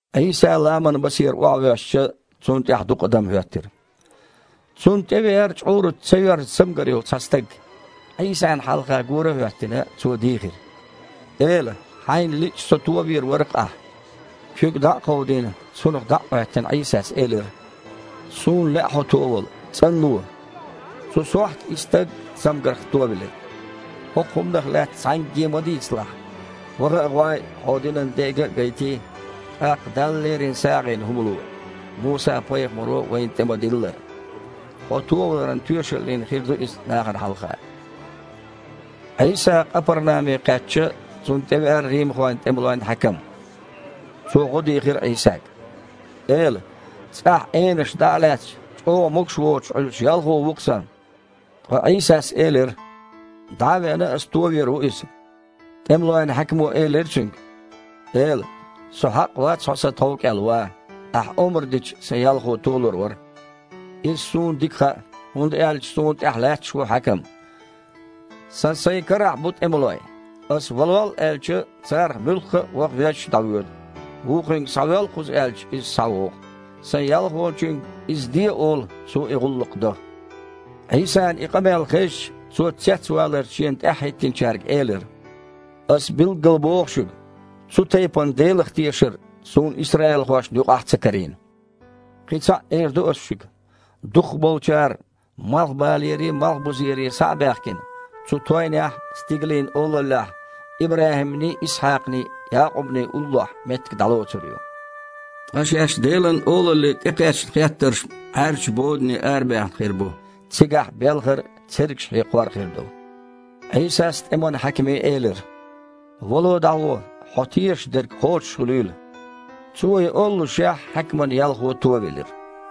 Іийса ламанан басера охьавоьссича, Цунна тІаьхьа дукха адам хІоьттира. Цунна тІе веара чкъураца ца йоьрзу цамгар йолу цхьа стаг. Іийсана хьалха гора а хІоьттина, цо дийхира: «Эла! Хьайна лиъча, со товийр вара-кх Ахьа». Куьг дІа а кховдийна, цунах дІа а Іоьттина, Іийсас элира: «Суна лаьа хьо товала! ЦІанло!» Цу сохьта и стаг цамгарх товелира. «ХІокху хІуманах лаьцна цхьаьнгге ма дийцалахь. Ваха а гІой, хьо динан дега а гайтий, тІаккха Далла лерина сагІина хІума ло, Муса-пайхамаро вайна тІе-ма-диллара. Хьо товаларан тоьшаллина хир ду иза нахана хьалха». Іийса Къапарнаме кхаьчча, Цунна тІевеара римхойн тІемалойн хьаькам. Цо гІо дийхира Іийсага: «Эла! ЦІахь, энаша дІа а лаьцна, чІогІа могуш воцуш Іуьллуш ялхо ву-кх сан». Ткъа Іийсас элира: «ДІа а веана, Аса товийр ву иза». ТІемалойн хьаькамо элира Цуьнга: «Эла! Со хьакъ вац Хьо сан тхов кІел ван. Ахьа омра дича, сан ялхо толур вара. Иза суна дика хаьа, хІунда аьлча суна тІехь лаьтташ а ву хьаькам. Сан сайн карахь а бу тІемалой. Аса „Валол!“ аьлча, царах муьлхха а ваха веззачу дІавоьду. Вукхуьнга „Схьавоьл кхуза!“ аьлча, иза схьавогІу. Сайн ялхочуьнга „Иза де!“ олу, цо и гІуллакх до». Іийсана и къамел хезча, Цо цецваларца Шена тІаьхьахІоьттинчаьрга элира: «Ас билггал боху шуьга, цу тайпана Делах тешар Суна исраилхошна юкъахь а ца карийна. Кхин цхьаъ эр ду Аса шуьга: дукхахболчара малхбалерий, малхбузерий схьа а баьхкина, цу тойнехь Стигалийн Олаллехь ИбрахІимний, Исхьакхний, Якъубний уллохь меттиг дІалоцур ю. Ткъа Шаьш Делан Олалле тІекхаьчна хеттарш-м Іаьржачу бодане арабаьхна хир бу. Цигахь белхар а, цергаш хьекхор а хир ду». Іийсас тІеман хьаькаме элира: «Вало, дІагІо, хьо тешаш дерг кхочушхуьлийла». Цо и оллушехь, хьаькаман ялхо товелира.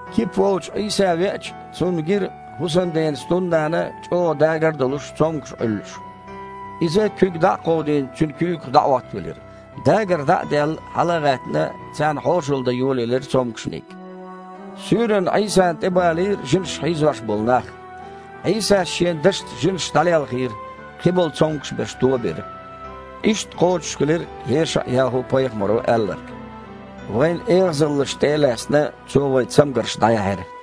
Кипа волчу Іийса веача, Цунна гира, хІусамден стуннана, чІогІа дгар а долуш, цомгуш Іуьллуш. Иза, куьг дІа а кховдийна, цуьнан куьйгах дІаІоттавелира. Дгар дІа а даьлла, хьала а гІаьттина, царна хьошалла дан йолаелира цомгушниг. Суьйранна Іийсана тІебалийра жинаша хьийзош болу нах. Іийсас Шен дашаца жинаш дІалелхийра, кхиболу цомгуш берш туо а бира. Иштта кхочушхилира ЕшаІ-ЯхІу-пайхамаро аьлларг: «Вайн эгІазаллаш тІе а лаьцна, Цо вайн цамгарш дІаяьхьира».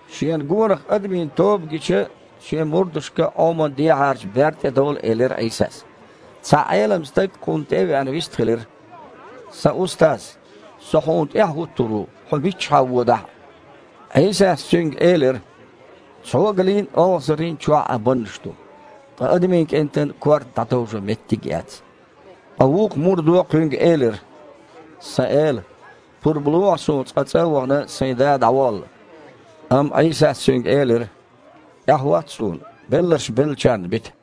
Шена гонах адамийн тоба гича, Шен мурдашка Іоман дехьарчу берда тІе довла элира Іийсас. Цхьа Іелам стаг, Кхунна тІе а веана, вистхилира: «Сан Устаз, со Хьуна тІаьхьа хІуттур ву, Хьо миччахьа а водахь а». Іийсас цуьнга элира: «Цхьогалийн а, олхазарийн а чохь Іан баннаш ду, ткъа Адамийн КІентан корта дІатовжо меттиг а яц». Ткъа вукху мурдо Кхуьнга элира: «Сан Эла! Пурба лохьа суна, цкъа, цІа а вахана, сайн да дІаволла». Амма Іийсас цуьнга элира: «ТІаьхьахІотта Суна, белларш беллачарна бита».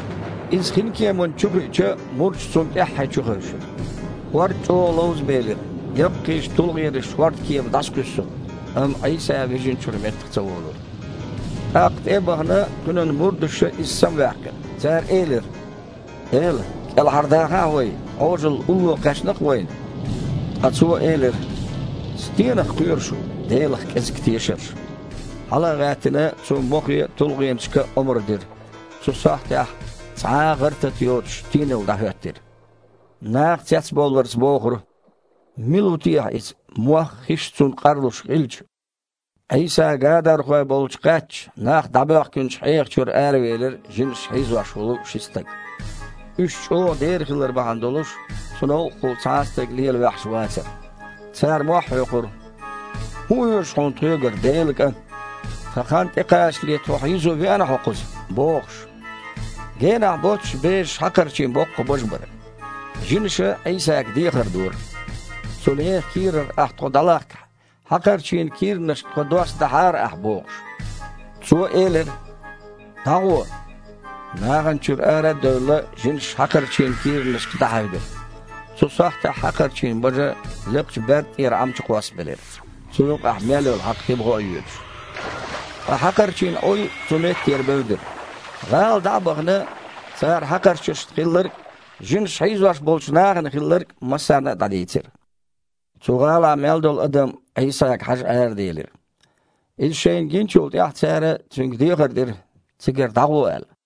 Иза хинкеманна чу хиича, мурдаш Цунна тІаьххье чухевшира. ХІорд чІогІа ловзабелира, яккхийчу тулгІенаша хІордкема дІасакхуьйсура. Амма Іийса вижначуьра меттах ца волура. ТІаккха, тІе а бахана, Кхуьнан мурдаша Иза самаваьккхира. Цара элира: «Эла! КІелхьардахахьа вай! Іожалла улло кхаьчна-кх вайна!» Ткъа Цо элира: «Стенах кхоьру шу, Делах кІезиг тешарш?» Хьала а гІаьттина, Цо мохе а, тулгІенашка а омра дира. Цу сахьтехь, цхьа а гІар-тата доцуш, тийналла дІахІоьттира. Наха цецбовларца бохура: «Мила ву техьа Иза, мох а, хиш а Цунна къарлуш хилча?» Іийса гадархой болчу кхаьчча, нах дІабоьхкинчу хьеха чуьра аравелира жинаша хьийзош волу ши стаг. Уьш чІогІа дера хилар бахьана долуш, цу новкъахула цхьа а стаг лела ваьхьаш вацара. Цара мохь хьоькхура: «ХІун оьшу Хьуна тхоьгара, Делан КІант? Тхан хан тІекхачале, тхо хьийзо веана Хьо кхуза?» – бохуш. Генахь боццуш бежаш хьакхарчийн боккха бажа бара. Жинаша Іийсага дехар дора: «Цу нехан кийрара Ахьа тхо лахкахь, хьакхарчийн кийранашка тхо доссадахьара Ахьа», – бохуш. Цо элира: «ДІагІо!» Нахана чуьра ара а девлла, жинаш хьакхарчийн кийранашка дІахьаьвдира. Цу сахьтехь хьакхарчийн бажа лекхачу берда тІера Іам чу кхоссабелира, цу юкъахь мел йолу хьакха хи буха а йоьдуш. Ткъа хьакхарчийн Іуй цу меттера бевдира. ГІала дІа а бахана, цара хьакхарчашна хилларг а, жинаша хьийзош болчу нахана хилларг а массарна дІадийцира. Цу гІалахь мел долу адам Іийсага хьажа араделира. Иза шайна гиначул тІаьхьа цара Цуьнга дехар дира, цигара дІагІо аьлла.